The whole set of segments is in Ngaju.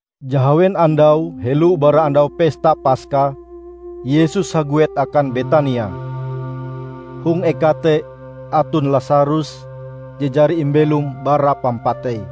Jahawen andau helo bara Andau Pesta Paska, Yesus haguet akan Betania. Hong eka te aton Lasarus je jari imbelom bara pampatei.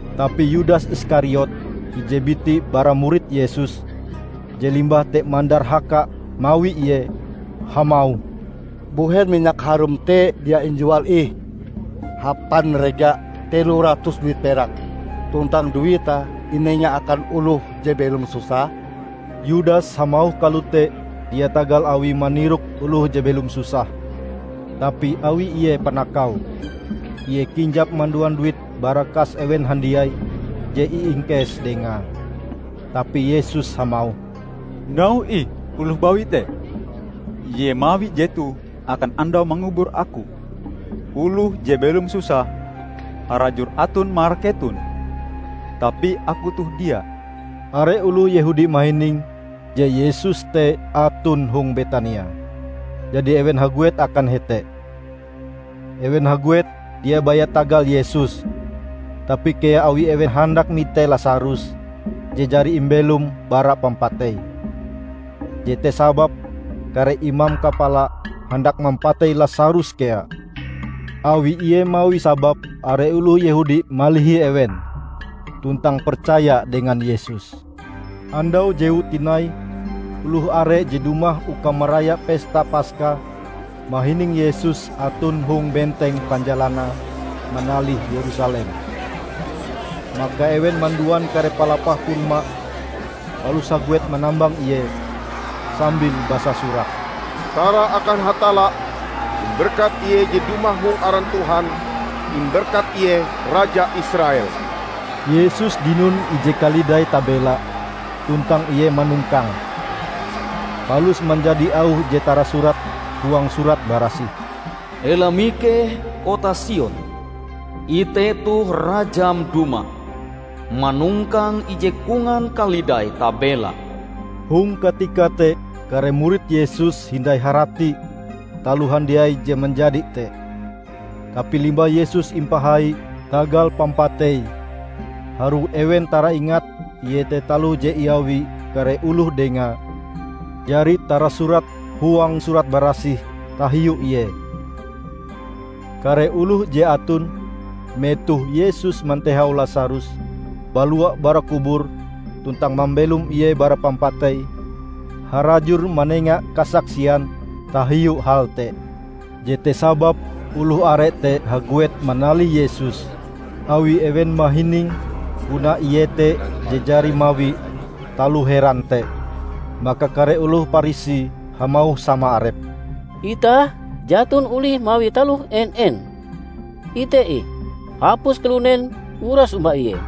Tapi Yudas Iskariot, ije biti bara murid Yesus -- je limbah te mandarhaka mawi Ie -- hamauh, "Mbuhen minyak harum te dia injual ih hapan rega telo ratus duit perak, tuntang duite inenga akan oloh je belom susah?" Yudas hamauh kalote dia tagal awie manirok oloh je belom susah, tapi awi ie panakau. Ie kinjap manduan duit bara kas ewen handiai je iingkes dengae. Tapi Yesus hamauh, "Nauhe ih oloh bawi te! Ie mawi jetoh akan andau mangubur Aku. Oloh je belom susah harajur aton marak keton, tapi Aku toh dia." Are oloh Yehudi mahining je Yesus te aton hong Betania, jadi ewen haguet akan hete. Ewen haguet dia baya tagal Yesus, tapi kea awi ewen handak mite Lasarus je jari imbelome bara pampatei. Jete sababe kare imam kapala handak mampatei Lasarus kea; awi Ie mawi sabab are oloh Yehudi malihi ewen tuntang percaya dengan Yesus. Andau jewue tinai oloh are je dumah uka maraya pesta Paska mahining Yesus aton hong benteng panjalanae manalih Yerusalem. Maka ewen manduan kare palapah korma palus haguet manambang Ie, sambil basasurak, "Tara akan Hatalla! Imberkat Ie je dumah hong aran Tuhan. Imberkat Ie Raja Israel!" Yesus dinon ije kalidai tabela, tuntang Ie manongkange. Palus manjadi auh je tarasurat huang Surat Barasih: "Ela mikeh, kota Sion! Ite toh Rajam dumah, manongkang ije kongan kalidai tabela!" Hong katika te kare murid Yesus hindai haratie taloh handiai je manjadi te. Tapi limbah Yesus impahai tagal pampateie, harue ewen taraingat iete taloh je iawi kare oloh dengae jari tarasurat huang Surat Barasih tahiu Ie. Kare oloh je aton metoh Yesus mantehau Lasarus balua bara kubur tuntang mambelom ie bara pampatei, harajur manenga kasaksian tahiu hal te. Jete sababe oloh are te haguet manalih Yesus awi ewen mahining puna Ie te je jari mawi taloh heran te. Maka kare oloh Parisi hamauh sama arepe, "Itah jaton olih mawi taloh en-en! Ite ih, hapus kalunen uras omba Ie!"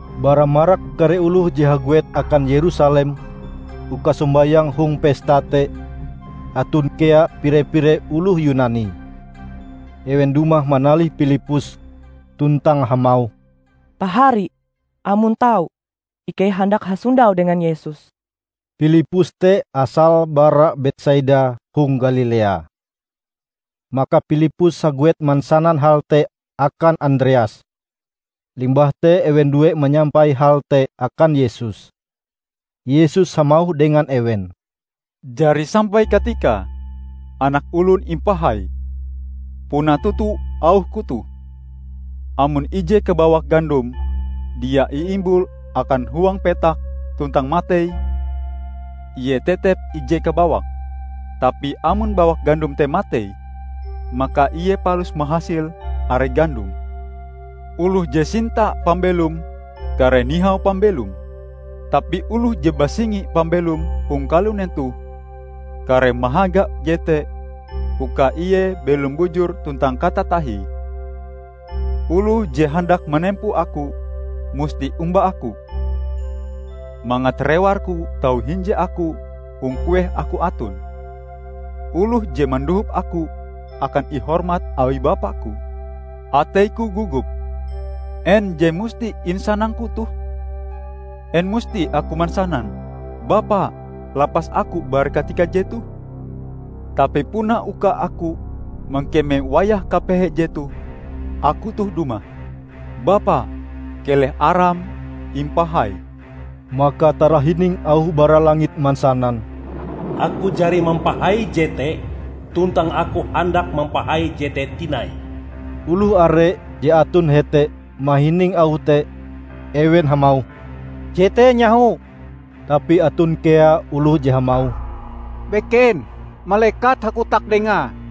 Bara marak kare oloh je haguet akan Yerusalem uka sombayang hong pesta te, aton kea pire-pire oloh Yunani. Ewen dumah manalih Pilippus tuntang hamauh, "Pahari, amon tau, ikei handak hasondau dengan Yesus." (Pilippus te asale bara Betsaida hong Galilea.) Maka Pilippus haguet mansanan hal te akan Andreas, limbah te ewen due manyampai hal te akan Yesus. Yesus hamauh dengan ewen, "Jari sampai katikae Anak Olon impahai. Puna toto auh-Ku toh: Amon ije kabawak gandom dia iimbul akan huang petak tuntang matei, ie tetep ije kabawak. Tapi amon bawak gandom te matei, maka ie palus mahasil are gandom. Oloh je sinta pambelome kareh nihau pambelome. Tapi oloh je basingi pambelome hong kalunen toh, kareh mahaga jete uka ie belom bujur tuntang katatahie. Oloh je handak manempo Aku musti omba Aku; mangat rewar-Ku tau hinje Aku hong kueh Aku aton. Oloh je mandohop Aku akan ihormat awi Bapa-Ku." "Atei-Ku gogop; en je musti insanang-Ku toh? En musti Aku mansanan, 'Bapa, lapas Aku bara katika jetoh'? Tapi puna uka Aku mangkeme wayah kapehe jetoh Aku toh dumah. Bapa, keleh Aram impahai!" Maka tarahining auh bara langit mansanan, "Aku jari mampahai jete, tuntang Aku handak mampahai jete tinai." Oloh are je aton hete mahining auh te. Ewen hamauh, "Jete nyaho!" Tapi aton kea oloh je hamauh, "Beken! Malekat hakotak dengae!"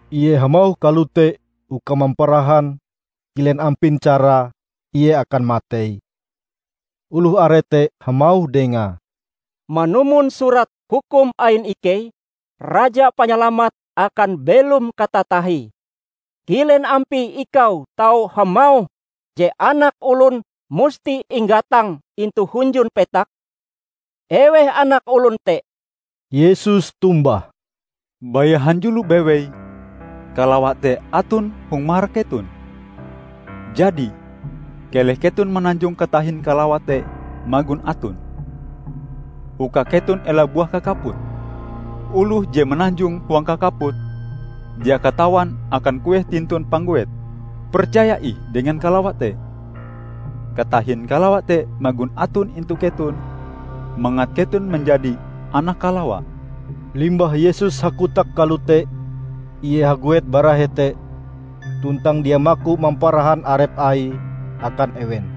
Ie hamauh kalote uka mamparahan kilen ampin carae Ie akan matei. Oloh are te hamauh Dengae, "Manumon Surat Hukum ain ikei, Raja Panyalamat akan belom katatahie. Kilen ampie Ikau tau hamauh je Anak Olon musti inggatang intu hunjun petak? Eweh Anak Olon te?" Yesus tombah, "Baya hanjulo bewei kalawa te aton hong marak keton. Jadi, keleh keton mananjong katahin kalawa te magon aton, uka keton ela buah kakaput. Oloh je mananjong huang kakaput, dia katawan akan kueh tintun pangguete. Percaya ih dengan kalawa te, katahin kalawa te magon aton intu keton, mangat keton manjadi anak kalawa." Limbah Yesus hakotak kalote, Ie haguet bara hete tuntang dia maku mamparahan arep Aie akan ewen.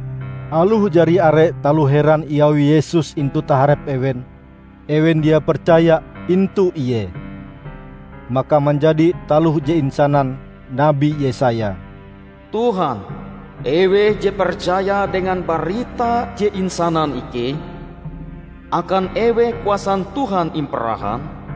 Aloh jari are taloh heran iawi Yesus intu taharep ewen, ewen dia percaya intu Ie. Maka manjadi taloh je isanan Nabi Yesaya, "Tuhan, eweh je percaya dengan barita je insanan ikei? Akan eweh kuasan Tuhan imparahan?"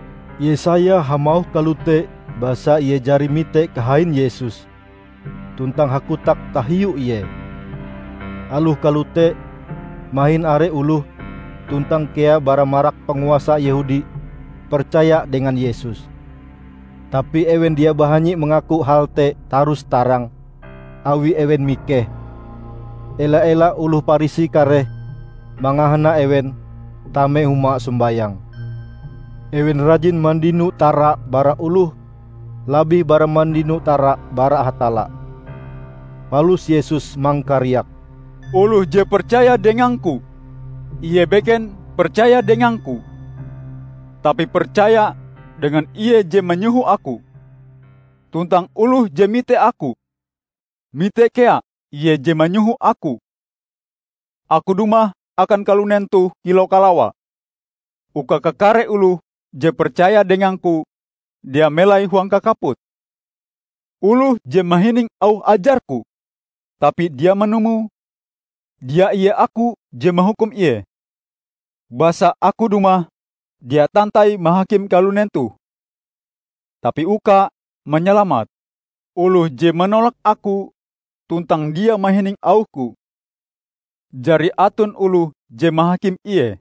Yesaya hamauh kalote basa ie jari mite kahain Yesus, tuntang hakotak tahiu Ie. Aloh kalote, mahin are oloh, tuntang kea bara marak panguasa Yehudi percaya dengan Yesus. Tapi ewen dia bahanyi mangaku hal te tarus-tarang, awi ewen mikeh, ela-ela oloh Parisi kareh mangahana ewen tame huma sombayang. Ewen rajin mandino tara bara oloh labih bara mandino tara bara Hatalla. Palus Yesus mangkariak, "Oloh je percaya dengang-Ku, ie beken percaya dengang-Ku, tapi percaya dengan Ie je manyoho Aku. Tuntang oloh je mite Aku, mite kea Ie je manyoho Aku. Aku dumah akan kalunen toh kilau kalawa, uka kakare oloh je percaya dengang-Ku dia melai huang kakaput. Oloh je mahining auh ajar-Ku, tapi dia manumoe -- dia ie Aku je mahukum ie. Basa Aku dumah dia tantai mahakim kalunen toh, tapi uka manyalamate. Oloh je manolak Aku tuntang dia mahining auh-Ku, jari aton oloh je mahakim ie.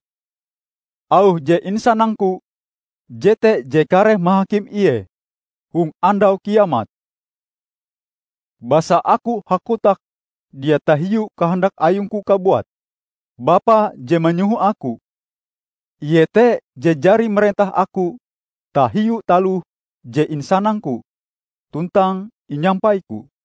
Auh je insanang-Ku, jete je kareh mahakim ie hong Andau Kiamat. Basa Aku hakotak dia tahiu kahandak ayung-Ku kabuat; Bapa je manyoho Aku, Ie te je jari marentah Aku tahiu taloh je insanang-Ku tuntang inyampai-Ku.